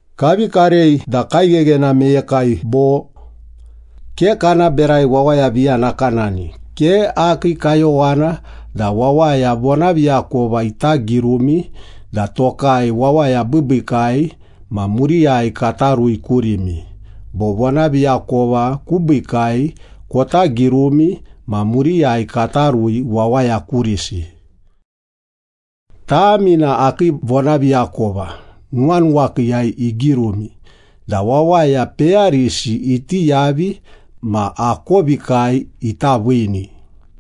Kavi karei da kaigheghena meyekai bo? Ke kana berai wawaya viya nakanani, ke akii kayowana da wawaya vonaviakova ita girumi da tokai wawaya biibiikai ma muriyai kata rui kurimi, bo vonaviakova kubiikai kota girumi ma muriyai kata rui wawaya kurisi. Tami na akii vonaviakova, nuwanuwakiiyai igirumi da wawaya peyarisi iti yavi ma akovikai ita viini.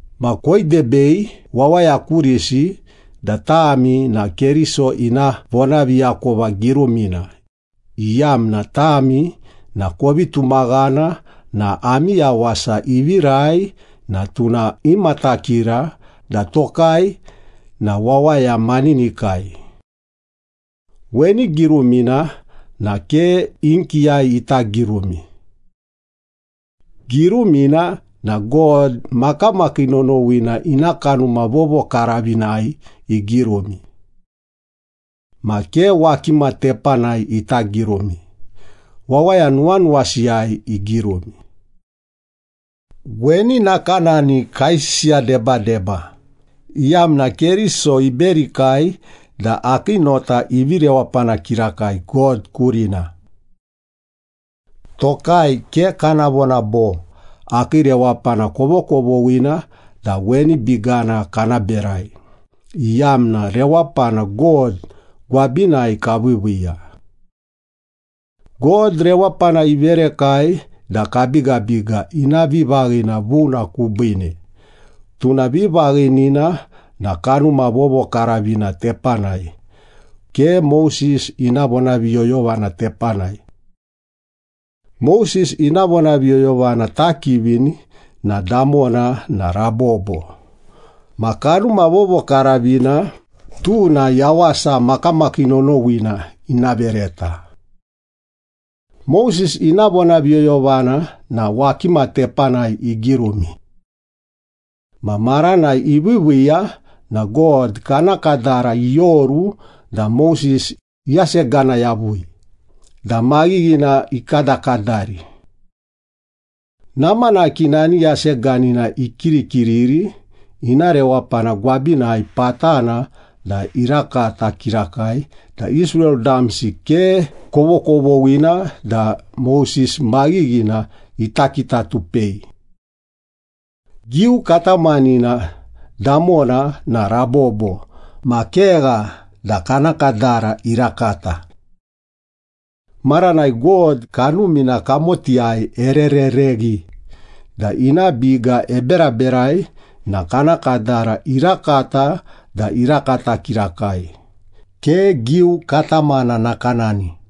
Ma koidebei wawaya kurisi da tami na Keriso ina vonaviakova girumina, iyamna tami na kovi tumaghana na ami yawasi ivirai na tuna imatakira da tokai na wawaya maninikai. Weni girumina na ke inkiyai ita girumi. Girumina na God makamakii nonowina ina Kanuma Vovokaravinai igirumi. Ma ke wakima tepanai ita girumi, wawaya nuwanuwasiyai igirumi. Weni nakanani kaisisiya debadeba, iyamna Keriso iberikai da akii nota ivi rewapana kirakai God kurina. Tokai ke kana vona bo, “Akii rewapana kovokovoghina da weni bigana kana berai,” iyamna rewapana God gwabinai kaviiviiya. God rewapana iverekai da kabigabiga ina vivaghina vuna kubiine, tuna vivaghinina na Kanuma Vovokaravina tepanai, ke Moses ina vonaviyoyovana tepanai. Moses ina vonaviyoyovana takivini na damona na rabobo, ma Kanuma Vovokaravina, tuna yawasa makamakii nonowina ina vereta. Moses ina vonaviyoyovana na wakima tepanai igirumi. Ma maranai iviiviiya na God kana kadara ioru da Moses iyasegana yavui da maghighina ikadakadari. Namanaki nani yaseganina ikirikiriri, ina rewapana gwabinai patana da irakata kirakai da Israel damsi ke kovokovoghina da Moses maghighina ita kitatupei. Giu katamanina damona na rabobo ma kegha da kana kadara irakata. Maranai God Kanumina kamotiyai ererereghi da ina biga eberaberai na kana kadara irakata da irakata kirakai, ke giu katamana nakanani.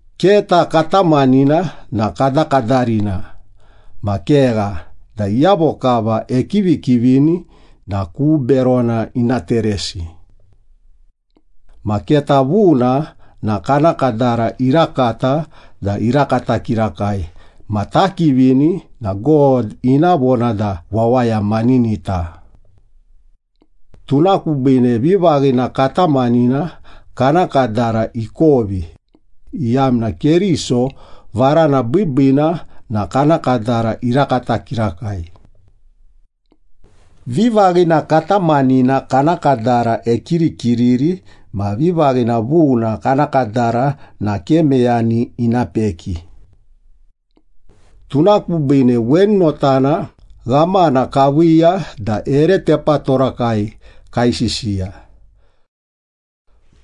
Keta katamanina na kadakadarina ma kegha da iyavo kava ekivikivini na ku berona ina teresi. Ma keta vuna na kana kadara irakata da irakata kirakai ma takivini na God ina vona da wawaya maninita. Tuna kubiine vivaghina katamanina kana kadara ikovi, iyamna Keriso varana biibiina na kana kadara irakata kirakai. Vivaghina katamanina kana kadara ekirikiriri ma vivaghina vuna kana kadara na ke meyani ina peki. Tuna kubiine weni notana ghamana kaviiya da ere tepatorakai kaisisiya.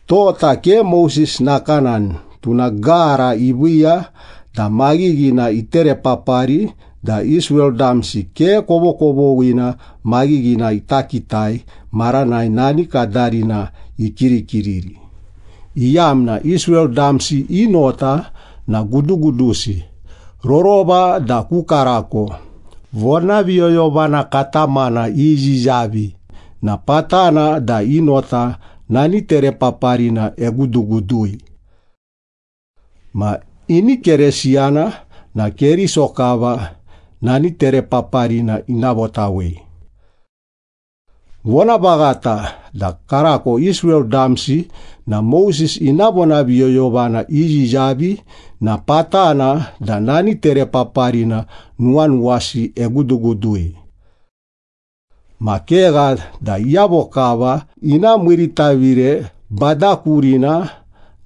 Tota ke Moses nakanani, tuna gara iviiya da maghighina iterepapari da Israel damsi ke kovokovoghina maghighina ita kitai maranai nani kadarina ikirikiriri, iyamna Israel damsi i nota na gudugudusi, rorova da ku karako vonaviyoyovana katamana iyiyavi na patana da i nota nani terepaparina egudugudui. Ma ini Keresiyana na Keriso kava nani terepaparina ina votawei. Vonavaghata da karako Israel damsi na Moses ina vonaviyoyovana iyiyavi na patana da nani terepaparina nuwanuwasi egudugudui. Ma kegha da iyavo kava ina miiritavire Bada kurina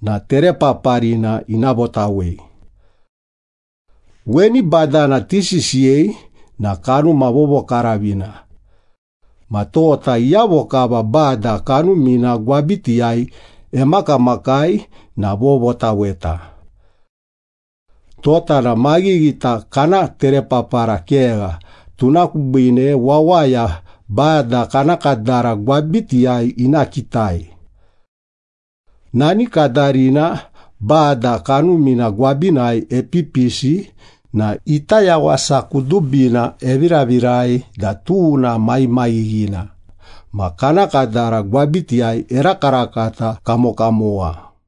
na terepaparina ina votawei. Weni Badana tisisiyei na Kanuma Vovokaravina. Ma tota iyavo kava Bada Kanumina gwabitiyai emakamakai na vovotaweta. Tota na maghighita kana terepapara kegha, tuna kubiine wawaya Bada kana kadara gwabitiyai ina kitai. Nani kadarina Bada Kanumina gwabinai epipisi na ita yawasa kudubina eviravirai da tuna maghimaghighina, ma kana kadara gwabitiyai erakarakata kamokamowa.